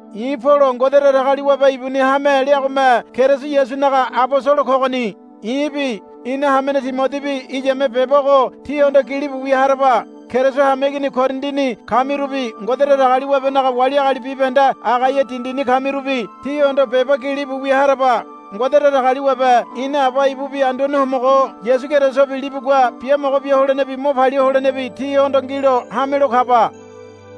I̱ Polo Ngode Datagaliwabe ibuni hame leagome Keriso Yasunaga abosolo kogoni. I̱bi ina hamene Timodibi iyame beba ogo tíhondo gilibu wia haraba. Keriso hameigini Korindini kamirubi Ngode Datagaliwabenaga wali agali bibahende Agaia dindini kamirubi tíhondo beba gilibu wia haraba. Ngode Datagaliwabe ina Aba ibubi Anduane Homogo Yasu Kerisobi libugua biamogo bia holenebi mo palia holenebi tíhondo ngilo hamelo kaba.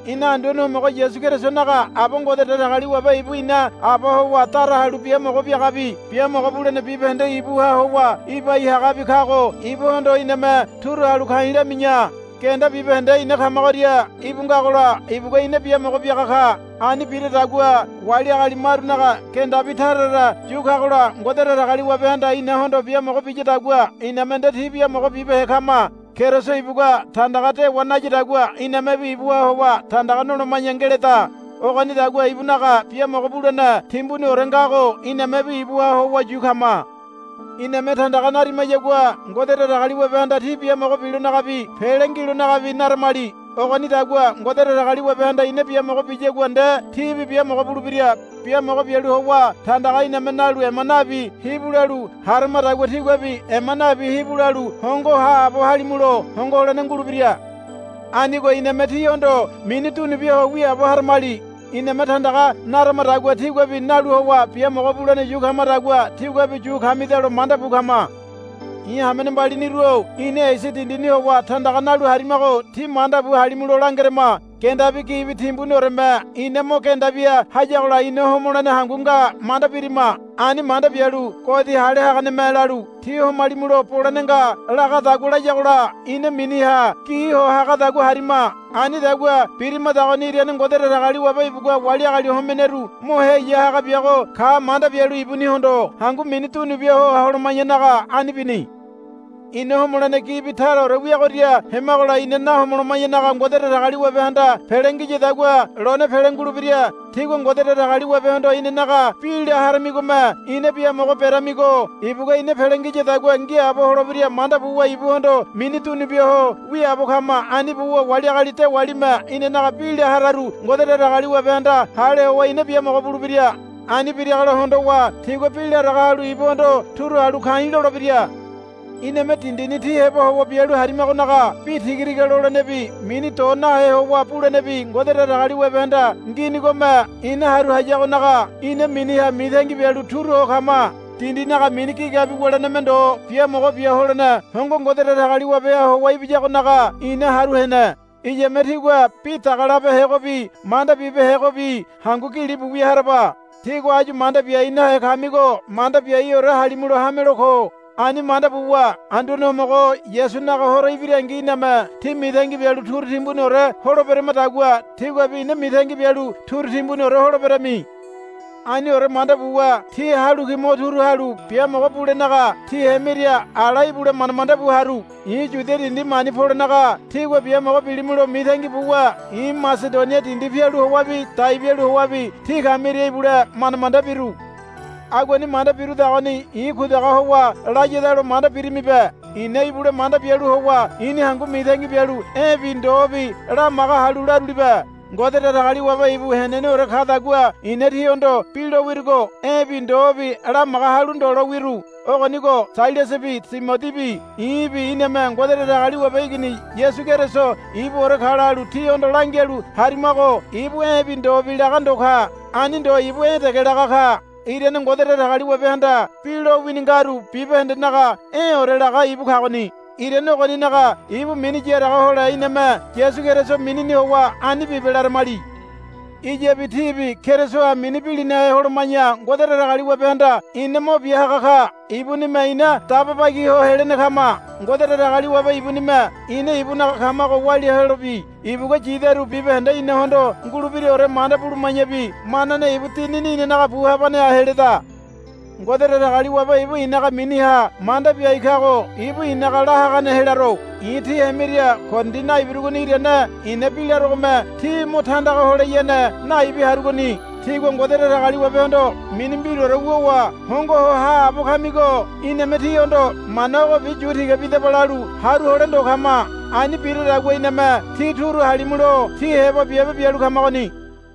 Ina Anduane Homogo Yasu Kerisonaga Aba Ngode Datagaliwabe ibu ina Aba howa dara halu biamogo biagabi biamogo bulene bibahende ibuha howa ibai hagabi kago ibuhondo iname turu halu ka̱i̱ lami̱ya. Genda bibahende ina kamagoria íbu ngagola ibugua ina biamogo biaga ka. Ani biradagua wali agali marunaga gendabi tara tara yu kagola Ngode Datagaliwabehanda inahondo biamogo biyadagua iname nde ti biamogo bibehe kama. Keriso ibugua tandaga dewa nayadagua inamebi ibuha howa tandaga noloma̱ya ngeleda. Ogonidagua ibunaga biamogo bulene timbuniore ngago inamebi ibuha howa yu kama. Iname tandaga narimayagua Ngode Datagaliwabehanda tí biamogo bilonagabi pele ngilonagabi naramali. Ogonidagua Ngode Datagaliwabehanda ina biamogo biyagua nde tíbi biamogo bulebira. Biamogo bialu howa tandaga iname nalu ema nabi hibu lalu haramadagua tíguabi ema nabi hibu lalu hongo haabo halimulo hongo holene ngulebira. Anigo iname tíhondo mini dunu bia ho wiaabo haramali. Iname tandaga naramadagua tíguabi nalu howa biamogo bulene yu kamadagua tíguabi yu kamidalo manda bu kama. I̱ hamene mbaliniru-o ina Esia dindini howa tandaga nalu harimago tí manda bu halimulo langerama. Gendabi gibi timbunioreme ina mo genda bia hayagola ina homolene hangu nga manda birima. Ani manda bialu godi hale haganeme lalu, Tí homalimulo bolene nga, lagadagua layagola ina miniha gi ho hagadagua harima. Anidagua birimadagoni irane Ngode Datagaliwabe ibugua wali agali homeneru mo heya haga biago ka manda bialu ibunihondo hangu mini dunubia ho holoma̱yanaga ani bini. Ina homolene gibi taraore wiagoria hemagola ina nahomoloma̱yanaga Ngode Datagaliwabehanda pele ngiyadagua lone pele ngulebira. Tígua Ngode Datagaliwabehondo inanaga bi la haramigome ina biamogo beramigo ibugua ina pele ngiyadagua ngiaabo holebira manda buwa ibuhondo mini dunu bia ho wiaabo kama. Ani buwa wali agali dewalime inanaga bi la hararu Ngode Datagaliwabehanda hale howa ina biamogo bulebira. Ani biragola hondowa tigua bi laraga halu ibuhondo turu halu ka̱i̱ lolebira. Iname dindini tí heba howa bialu harimagonaga bi tiga tiga lolenebi mini do nahe howa bulenebi Ngode Datagaliwabehanda nginigome ina haru hayagonaga ina miniha mitangi bialu turu ho kama. Dindinaga mini gigabi wuleneme ndo biamogo bia holene hongo Ngode Datagaliwabeha howa ibiyagonaga ina haru hene. Iyame tígua bi dagalabehegobi manda bibehegobi hangu gilibu wia haraba. Tígua áyu manda biai nahe kamigo manda biaiore halimulo hamelo ko. Ani manda buwa Anduane Homogo Yasunaga Horo ibirangi iname tí mitangi bialu turu timbuniore holeberamadagua tíguabi ina mitangi bialu turu timbuniore holeberami. Aniore manda buwa tí halu ki mo turu halu biamogo bulenaga tí hemiria ala ibule manda manda bu haru. I̱ Yudia dindi mani polenaga tígua biamogo bilimulo mitangi buwa i̱ Masedonia dindi pialu howabi dai bialu howabi tí kamiria ibule manda manda biru. Aguani manda birudagoni i̱ kudaga howa layadalo manda birimibe. I̱na ibule manda bialu howa i̱ni hangu mitangi bialu e̱bi ndobi lamaga halu larulibe. Ngode Datagaliwabe ibu heneneore kadagua i̱na tíhondo bi lo wirugo e̱bi ndobi lamaga halu ndo lo wiru. Ogonigo Sailasabi Timodibi i̱bi iname Ngode Datagaliwabe Igini Yasu Keriso ibuore ka lalu tíhondo langialu harimago ibu e̱bi ndobi laga ndo ka. Ani ndo ibu e̱ dege laga ka. Irane Ngode Datagaliwabehanda bi lowini ngaru bibahendenaga e̱ore laga ibu kagoni. Irane ogoninaga ibu mini yaraga hole iname Yasu Keriso minini howa, Ani bibe, laramali. Iyabi tíbi Kerisoha mini bilinahe holoma̱ya Ngode Datagaliwabehanda ina mo bia haga ka. Ibunime ina daba bagi ho helene kama. Ngode Datagaliwabe ibunime ina ibunaga kamago walia helobi ibugua yidaru bibahende inahondo ngulebiraore manda buluma̱yabi manane ibu Dinini inanaga bu habaneha heleda. Ngode Datagaliwabe ibu i̱naga miniha manda biai kago ibu i̱naga la hagane helaro. I̱ tí hemiria Korindi naibirugoni irane i̱na bi larogome tí mo tandaga holeyane naibi harugoni. Tígua Ngode Datagaliwabehondo mini mbiraore wuwa hongo ho haabo kamigo iname tíhondo, Mana ogobi yu tiga bidaba, lalu haru hole ndo kama. Ani biradagua iname tí turu halimulo tí heba biabe bialu kamagoni.